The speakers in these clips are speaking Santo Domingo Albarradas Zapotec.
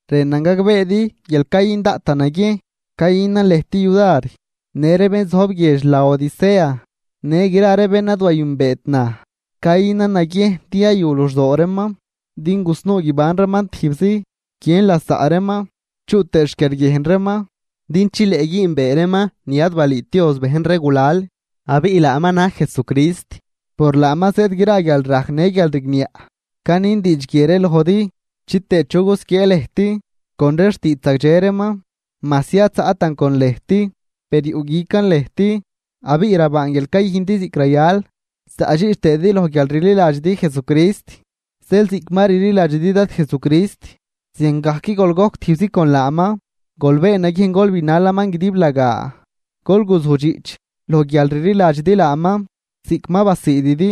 Rënan gagbeedi guial cayün daꞌtan naguiejn cayünan lëjt yudar, në ree bén zojb guiedx Laodicea në gra ree bén ad wayünbeet naj. Cayünan naguiejn din yayu luxdoo reeman din gusnuu guiban reeman tijbzi, guiën lasaꞌ reeman chuꞌ tëë xquiarguiejn reeman din chileꞌ güünbee reeman ni ad balüüt Dios bejn ree gulal abiꞌ laaman na̱j Jesucrist, por laaman zëëd gra guialrajc në guialrigniaꞌ. Canin diidx guie ree lojdi chitëë chu gusquiee lëjt con ree xtiidx zagdxe reeman. Majsi ad zaꞌtan con lëjt, per yuꞌguican lëjt abiꞌ rabaan guial cayüjndi ziꞌc rayal, zaꞌdxiꞌch tëëdi loj guialrliladxidi Jesucrist. Zeel ziꞌc ma rliladxidi Dad Jesucrist, ziangajc gol gojc tijbzi con laaman. Gol been naguiejn gol binalaman guidiblagaa, gol guzudxiꞌch loj guial rliladxidi laaman ziꞌc ma basiididi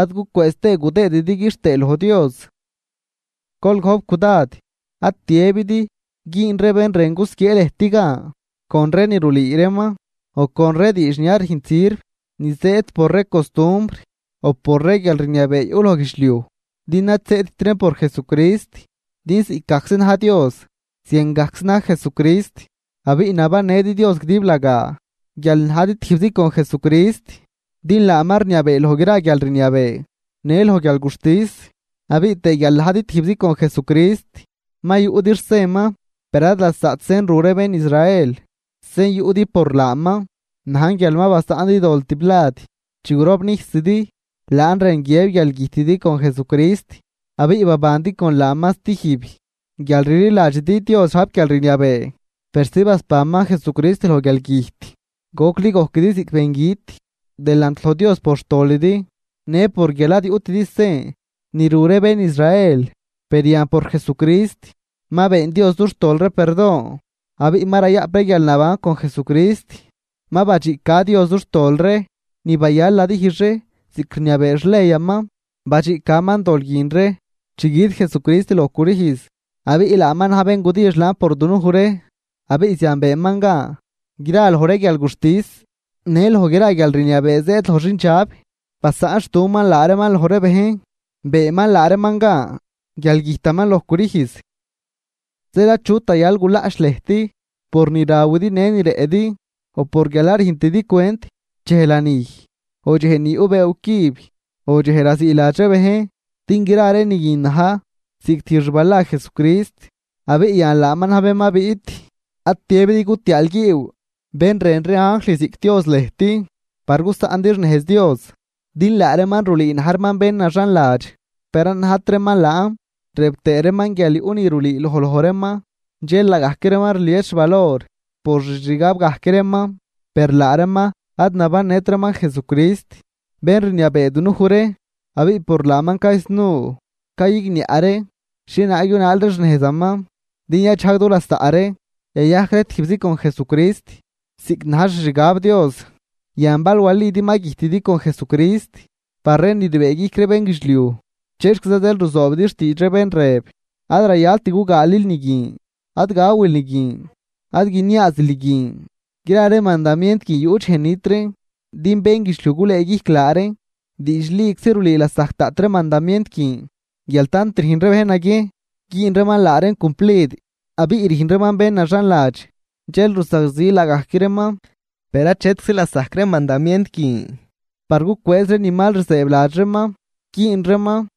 ad gucwëëz tëë gudëëdi quixtëë loj Dios. Gol gojp cudad, ad tiëbidi güün ree bén rën gusquiee lëjt gan con ree ni rulüü reeman o con ree diidx ni ad rüjnt sirv ni zëëd por ree costumbr o por ree guialrniabee yuꞌ loj guidxliuj, din ad zëëdt reen por Jesucrist. Din ziꞌcgajczi na̱j Dios, ziangajczi na̱j Jesucrist. Abiꞌ nabannëdi Dios guidiblagaa guial najdi tijbzi con Jesucrist, din laaman rniabee loj gra guialrniabee në loj guialguxtis. Abiꞌ tëë guial ma najdi tijbzi con Jesucrist ma yuꞌdi xsenman, per ad lasaꞌt sen ru ree bén Israel, sen yuꞌdi por laaman najn guial ma basaꞌndi dol tiblad. Chi gurobnijsidi, laan rën guiëb guial güjtidi con Jesucrist abiꞌ babandi con laaman stijb guial rliladxidi Dios rajp guialrniabee persi basbanman Jesucrist loj guialgüjt. Gocli gojquidi ziꞌc bengüt delant loj Dios por xtolidi në por guial ad guyutidi sen ni ru ree bén Israel. Per yan por Jesucrist, ma been Dios dux tol ree perdon abiꞌ ma rayaꞌp ree guialnaban con Jesucrist. Ma badxiꞌca Dios dux tol ree ni bayal nadijx ree ziꞌc rniabee xleyaman, badxiꞌcaman dol guin ree chi güt Jesucrist loj crüjz abiꞌ laaman na̱j bén gudijx laan por dunuj ree. Abiꞌ zian beenman gan gra loj ree guialguxtis në loj gra guialrniabee zëëd loj xindxab. Basaꞌnxtuman laa reeman loj ree bejn, beenman laa reeman gan guial güjtaman loj crüjz. Zeel achut rayal gulaꞌch lëjt por ni rawidi në ni rëꞌdi o por guial ad rüjntidi cwent dxej lanij o dxej ni yuꞌ bëëw cüb o dxej raziiladx ree bejn. Din gra ree ni guin na̱j ziꞌc tijb xbala Jesucrist abiꞌ yan laaman na̱j bén ma biꞌt. Ad tiëbidi gutiaalguiiw bén rën ree anjl ziꞌc Dios lëjt, par gusaꞌndi xnejz Dios, din laa reeman rulüü na̱j reeman bén naxanladx, per ad najt reeman laan rëb tëë reeman guial yuꞌ ni rulüüloj loj reeman. Dxel laagajc reeman rlies xvalor por xixgab gajc reeman. Per laa reeman ad nabannët reeman Jesucrist, bén rniabee dunuj ree. Abiꞌ por laaman caysnuu cayigniaꞌ ree xhienaag yunaal ree xnejzaman din yadxajg du lasaꞌ ree yayajc ree tijbzi con Jesucrist ziꞌc na̱j xixgab Dios. Yan bal walidi ma güjtidi con Jesucrist par ree ni rbëëguijc ree bénguidxliuj, ¿chexquiza zeel ruzoobidi xtiidx ree bén rëb: “Ad rayalt gugaalil ni guin, ad gawil ni guin, ad guiniaazil ni guin”? Gra ree mandamient guin yuꞌ dxej nit reen, din bénguidxliuj gulëëguijc laa reen. Diidxliczi rulüü lasajc daꞌt ree mandamient guin guial tant rüjn ree bejn naguiejn güün reeman laa reen cumplid abiꞌ rüjn reeman bén naxanladx dxel rusagzi laagajc reeman, per achetczi lasajc ree mandamient guin par gucwëëz reen ni mal rzëëbladx reeman güün reeman.